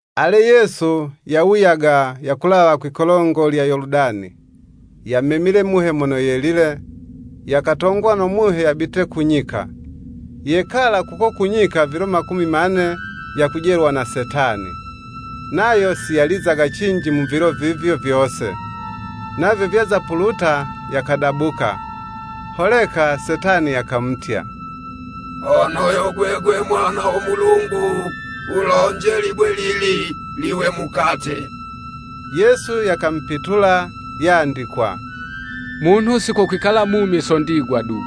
Ale Yesu yawuyaga yakulawa kwi'kolongo lya Yoludani, yamemile Muhe Mono Yelile, yakatongwa no Muhe yabite ku nyika. Yekala kuko ku nyika vilo makumi mane yakujelwa na Setani. Nayo si yalizaga cinji mu vilo vivyo vyose, navyo vyaza puluta, yakadabuka. Holeka Setani yakamutya, “Hono yo gwegwe Mwana wo Mulungu, wulonje libwe lili liwe mukate.” Yesu yakamupitula, yandikwa “Munhu si ko kwikala mumi so ndigwa du.”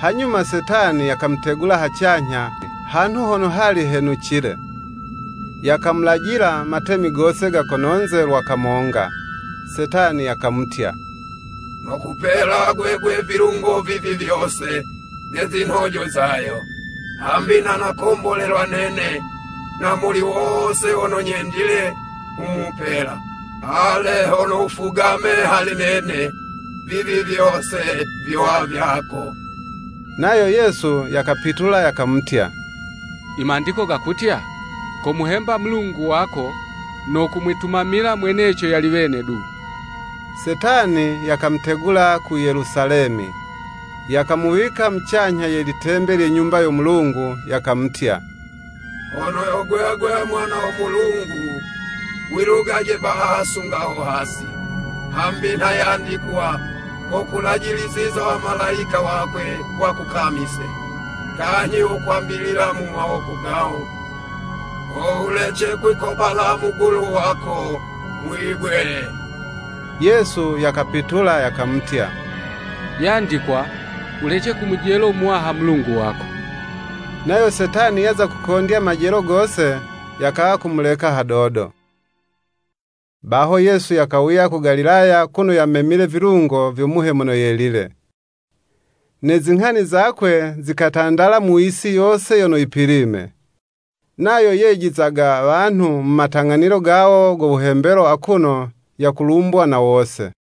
Hanyuma Setani yakamutegula hacanyha, hanhu hono hali henucile, yakamulajila matemi gose ga kononze lwa kamonga. Setani yakamutya, “Nokupela gwegwe vilungo vivi vyose, ne zinhojo zayo; hambi nha nakombolelwa nene, na muli wose mono nyendile, nghumupela. Ale hono wufugame hali nene, vivi vyose vyowa vyako.” Nayo Yesu yakapitula yakamutya, “I Mandiko gakutya, ‘Komuhemba Mulungu wako, no komwitumamila mweneco yali wene du.'" Setani yakamutegula ku Yelusalemi, yakamuwika mucanyha ye litembe lye Nyumba yo Mulungu, yakamutya, “Hono yo gwegwe mwana wo Mulungu, wilugaje baha sunga ho hasi, hambi nha yandikwa: ‘Kokulajiliziza Wamalayika wakwe wakukamise,’ kanyhi, ‘Wokwambilila mu mawoko gawo. Ho wulece kwikobala mugulu wako mwibwe.'" Yesu yakapitula yakamutya, “Yandikwa, ‘Wulece kumujelo Muwaha Mulungu wako.'" Nayo Setani yaza kukondya majelo gose, yakawa kumuleka hadodo. Baho Yesu yakawuya ku Galilaya kuno yamemile vilungo vyo Muhe Mono Yelile. Ne zinghani zakwe zikatandala mu yisi yose yono yipilime. Nayo yejizaga wanhu mu matang'anilo gawo go wuhembelo akuno yakulumbwa na wose.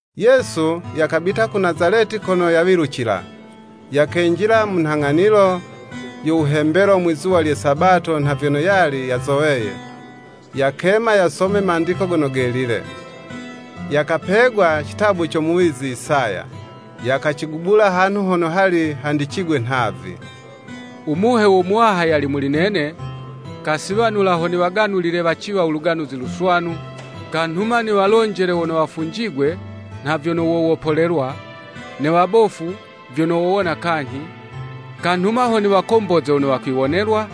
Yesu yakabita ku Nazaleti kono yawilucila, yakenjila mu nhang'anilo yo wuhembelo mwizuwa lye sabato nha vyono yali yazoweye, yakema yasome Mandiko Gono Gelile. Yakapegwa citabu co muwizi Isaya, yakacigubula hanhu hono hali handicigwe nhavi, “U Muhe wo Muwaha yali muli nene Kasiwanula, ho niwaganulile waciwa Luganuzi Luswanu, Kanhuma niwalonjele wono wafunjigwe, nha vyono wowopolelwa, Ne wabofu, vyono wowona kanyhi, Kanhuma ho niwakomboze wono wakwiwonelwa,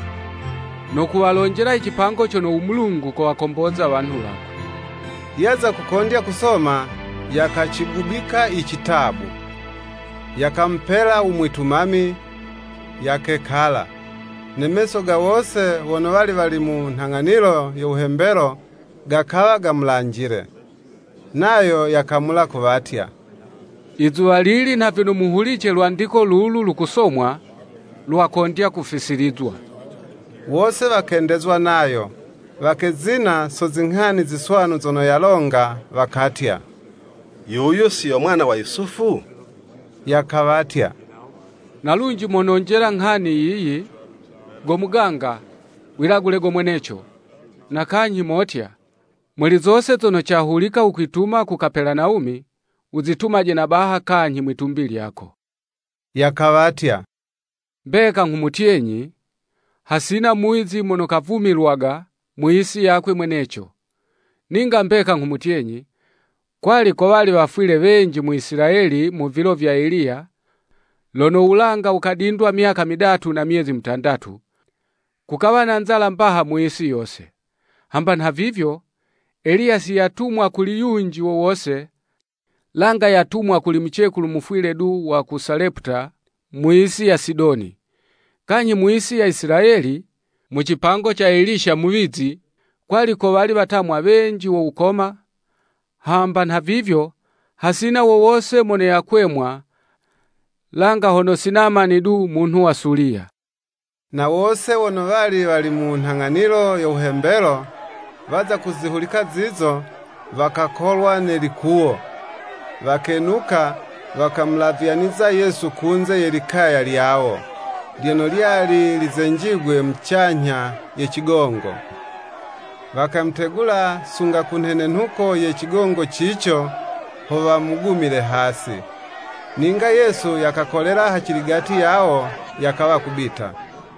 no kuwalonjela i cipango cono u Mulungu kowakomboza wanhu wakwe.” Yaza kukondya kusoma, yakacigubika icitabu, yakamupela u mwitumami, yakekala, ne meso ga wose wono wali wali mu nhang'anilo yo wuhembelo gakawa gamulanjile. Nayo yakamula kuwatya, “Izuwa lili nha vyono muhulice lwandiko lulu lukusomwa, lwakondya kufisilizwa.” Wose wakendezwa nayo, wakezina so zinghani ziswanu zono yalonga, wakatya, “Yuyu si yo mwana wa Yusufu?” Yakawatya, na lunji mononjela nghani yiyi, “Go muganga, wilagule go mweneco, na kanyhi motya, ‘Muli zose zono cahulika wukwituma ku Kapelanawumi, wuzitumaje na baha kanyhi mwitumbi lyako.'" Yakawatya, “Mbeka nghumutyenyi, hasina muwizi mono kavumilwaga mu yisi yakwe mweneco. Ninga mbeka nghumutyenyi, kwali kowali wafwile wenji mu Isilayeli mu vilo vya Eliya, lono wulanga wukadindwa myaka midatu na myezi mutandatu, kukawa na nzala mbaha mu yisi yose. Hamba nhavivyo, Eliya si yatumwa kuli yunji wowose, langa yatumwa kuli mucekulu mufwile du wa ku Saleputa mu yisi ya Sidoni. Kanyhi mu yisi ya Isilayeli, mu cipango ca Eliya muwizi, kwali kowali watamwa wenji wo wukoma, hamba nhavivyo hasina wowose mono yakwemwa, langa hono si Namani du munhu wa Suliya.” Na wose wono wali wali mu nhang'anilo yo wuhembelo, waza kuzihulika zizo, wakakolwa nelikuwo, wakenuka, wakamulavyaniza Yesu kunze ye likaya lyawo, lyono lyali lizenjigwe mucanyha ye cigongo, wakamutegula sunga ku nhenenhuko ye cigongo cico, ho wamugumile hasi. Ninga Yesu yakakolela haciligati yawo yakawa kubita.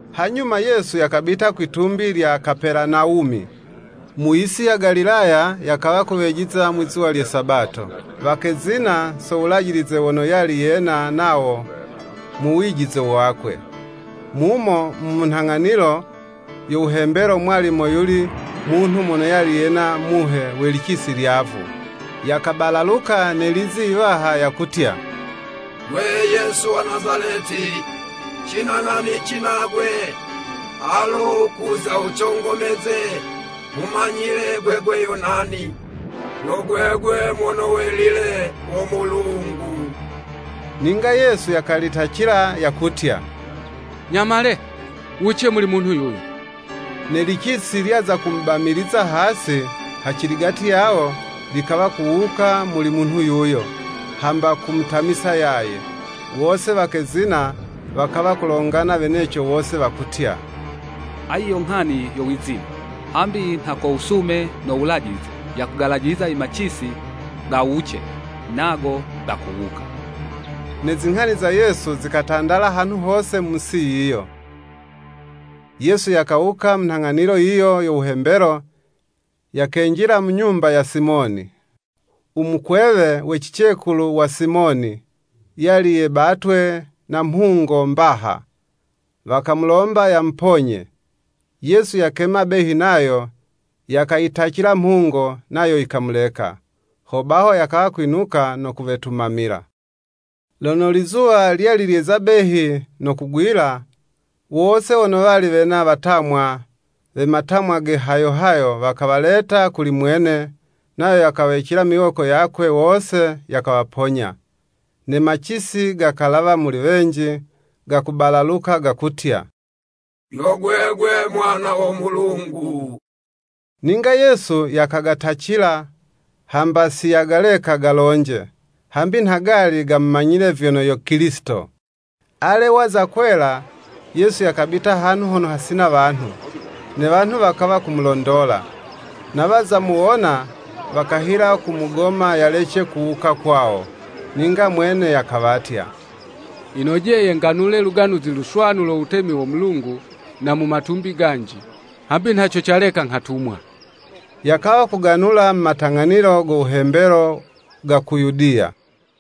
Hanyuma Yesu yakabita kwitumbi lya Kapelanawumi, mu yisi ya Galilaya yakawa kuwejiza mwizuwa lye Sabato. Wakezina so wulajilize wono yali yena nawo mu wijize wakwe. Mumo mu nhang'anilo yo wuhembelo mwali moyuli munhu mono yali yena muhe we licisi lyavu, yakabalaluka ne lizi iwaha, yakutya. “Gwe Yesu wa Nazaleti, cina nghanici nagwe? Alo kuza wucongomeze? Nghumanyile gwegwe yo nani, yo Gwegwe Mono welile wo Mulungu.” Ninga Yesu yakalitacila yakutya, “Nyamale, wuwuce muli munhu yuyo.” Ne licisi lyaza kumubamiliza hasi, haciligati yawo, likawa kuwuka muli munhu yuyo, hamba kumutamisa yaye. Wose wakezina, wakawa kulongana weneco wose, wakutya, “Ayi yo nghani yo wizine, hambi nha ko wusume no wulajilize, yakugalajiliza i macisi gawuce, nago gakuwuka.” Ne zinghani za Yesu zikatandala hanhu hose mu yisi yiyo. Yesu yakawuka mu nhang'anilo yiyo yo wuhembelo, yakenjila mu nyumba ya Simoni, u mukwewe we cicekulu wa Simoni, yali yebatwe na mhungo mbaha, wakamulomba yamuponye, Yesu yakema behi nayo, yakayitacila mhungo, nayo yikamuleka. Ho baho yakawa kwinuka no kuwetumamila. Lono lizuwa lyali lyeza behi no kugwila, wose wono wali wena watamwa we matamwa ge hayo hayo, wakawaleta kuli mwene, nayo yakawawicila miwoko yakwe wose, yakawaponya. Ne macisi gakalawa muli wenji, gakubalaluka, gakutya, “Yo gwegwe Mwana wo Mulungu.” Ninga Yesu yakagatacila, hamba si yagaleka galonje, hambi nha gali gamumanyile vyono yo Kilisito. Ale waza kwela, Yesu yakabita hanhu hono hasina wanhu, ne wanhu wakawa kumulondola, na waza muwona, wakahila kumugoma yalece kuwuka kwawo. Ninga mwene yakawatya, “Yinojeye nganule Luganuzi Luswanu lo wutemi wo Mulungu na mu matumbi ganji, hambi nha co caleka nghatumwa.” Yakawa kuganula mu matang'anilo go wuhembelo ga ku Yudiya.